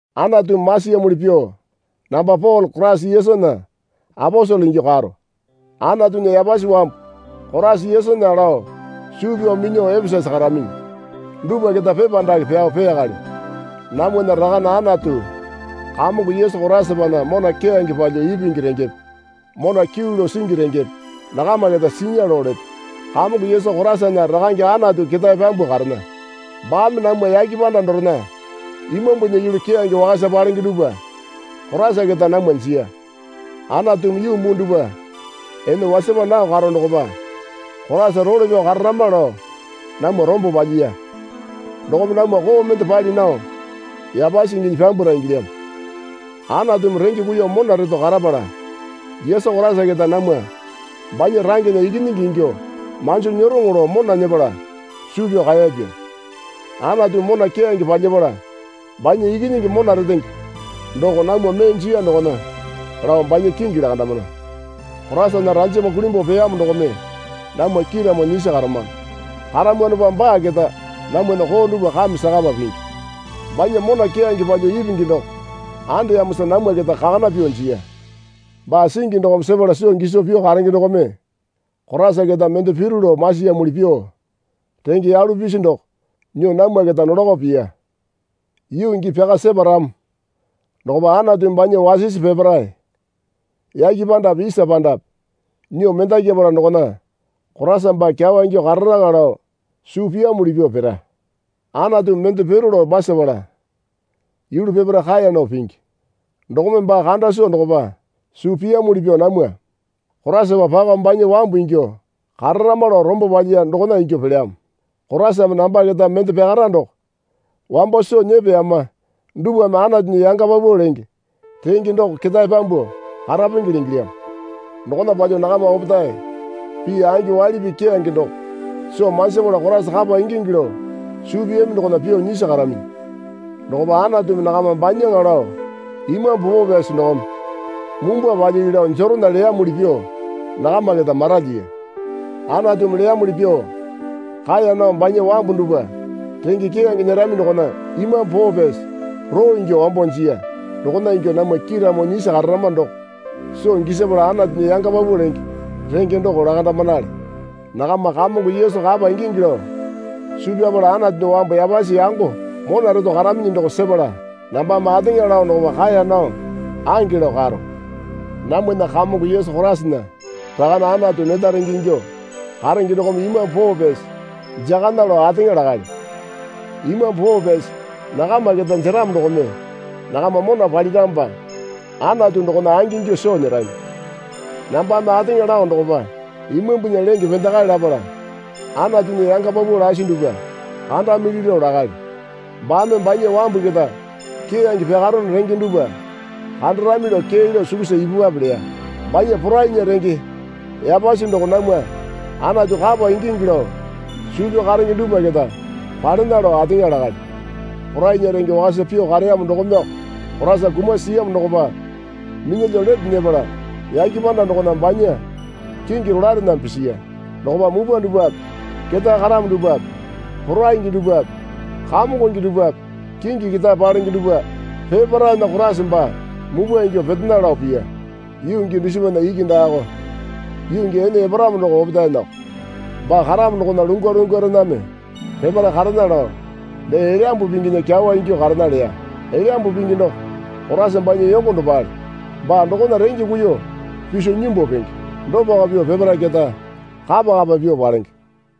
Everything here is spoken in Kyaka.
Anatumi masiyamuli pyuo namba Pole Koraisa Yesunya aposele ingyuo karo. Anatunya yapasi wambu Koraisa Yesunya lao suu pyao minyuo Epesasa karaminyi dupwa keta pepa dake pyao peyakalyo. Namwana Rakane Anatu Kamongo Yesu Koraisapana mona keyange palyuo ipingi rengepe mona kyuu lao singi rengepe nakama keta sinya lao leto. Kamongo Yesu Koraisana Rakange Anatu ketae pyambuo karena. Baame namwa yake panda dorena imambunya yulu keyange wakasa palenge dupwa Koraisa keta namwa jiya. Anatumi yuu muu dupwa ene wasapa nao karo dokopa Koraisa role pyao kararama lao namwa rombo palyiya. Dokome namwa koo mende pali nao yapasi inginyi pyambwara ingilyamo. Anatumi renge kuiyuo mona reto karapala Yesu Koraisa keta namwa banya rangena ikinyingi ingyuo manjo nyeroŋo lao mona nyepala suu pyao kaeyapya. Anatumi mona keyange palyapala banya Ikinyingi mona retenge doko namwa mee jiya dokona lao banya kingi lakandamana. Koraisana ranjama kulimbuo peyamo dokome namwa kiiramo nyisi karamano. Karamwanopa baa keta namwana koo dupwa kame sakapa pingi. Banya mona keyange palyuo ipingi doko andeyamosa namwa keta kakana pyuo jiya. Baa singi dokome sepala soo giso pyuo karenge dokome Koraisa keta mende piru lao masiyamuli pyuo renge yalu pisi doko nyuo namwa keta nolako piya. Yuu gii pyaka separamo dokopa Anatumi banya wasisi peparae yake pandape isa pandape nyuo mendakyapala dokona Koraisa baa kyawa ingyuo kararaŋa lao suu piyamuli pyuo pira. Anatumi mende piru lao masapala yulu peparae kaeya nao pingi. Dokome baa kanda soo dokopa suu piyamuli pyuo namwa Koraisapa pako banya wambu ingyuo kararama lao rombo palyiya dokona ingyuo pelyamo. Koraisame namba keta mende pyakara doko wambo soo nyepeyama dupwame Anatunya yanga paupau lenge renge doko ketae pyambuo karapengele ingilyamo. Dokona palyuo nakama opetae pii angi waili pii keyange doko soo manjipala Koraisa kapa ingingi lao suu piyami dokona pyuo nyisi karaminyi. Dokopa Anatumi nakama banyaŋa lao Imambu Poo Pyasi dokome mumbwa palyili lao jeronya leyamuli pyuo nakama keta maralyiya. Anatumi leyamuli pyuo kaeya nao banya wambu dupwa renge keyange nyerami dokona Imambu Poo Pyasi roo ingyuo wambo jiya. Dokona ingyuo namwa kiiramo nyisi kararama doko soo gisapala Anatunya yanga paupau lenge renge doko lakandamanale. Nakama Kamongo Yesu kapa ingingi lao suu pyapala Anatunya wambu yapasi yango mona reto karaminyi doko sepala nambame ateŋa lao dokopa kaeya nao ange lao karo. Namwana Kamongo Yesu Koraisana Rakane Anatu neta renge ingyuo karenge dokome Imambu Poo Pyasi jakana lao ateŋa lakalyo. Imambu Poo Pyasi nakama keta jeramo dokome nakama mona paliramopa Anatu dokona angingyuo soo nyerami. Nambame ateŋa lao dokopa imambunya lenge pendakae lapala Anatunya yanga paupau lasi dupwa kandamili lao lakalyo. Baame banya wambu keta keyange pyakarono renge dupwa kandarami lao kee lao sukusa ipupwape leya. Banya porainya renge yapasi doko namwa Anatu kapa ingingi lao suu pyao karenge dupwa keta palena lao ateŋa lakalyo. Porainya renge wakasa pyuo kareyamo dokomeyoko Koraisa kumasi siyamo dokopa minyalyuo lete nyepala yake panda dokona banya kingi rolaerename pisiya. Dokopa mupwa dupwape ketae karamo dupwape poraingi dupwape kamongonge dupwape kingi ketae palenge dupwa peparaena Koraisa baa mupwa ingyuo petena lao piya. Yuu gii dusipana iki daako, yuu gii ene eparamo doko opetaenako. Baa karamo dokona lungwa lungwarename peparae karena lao, dee Elyambu Pinginya kyawa ingyuo karena leya. Elyambu Pingi doko Koraisa banya yongo dopale. Baa dokona renge kuiyuo piso nyimbu penge. Dopako pyuo peparae keta kapa kapa pyuo palenge.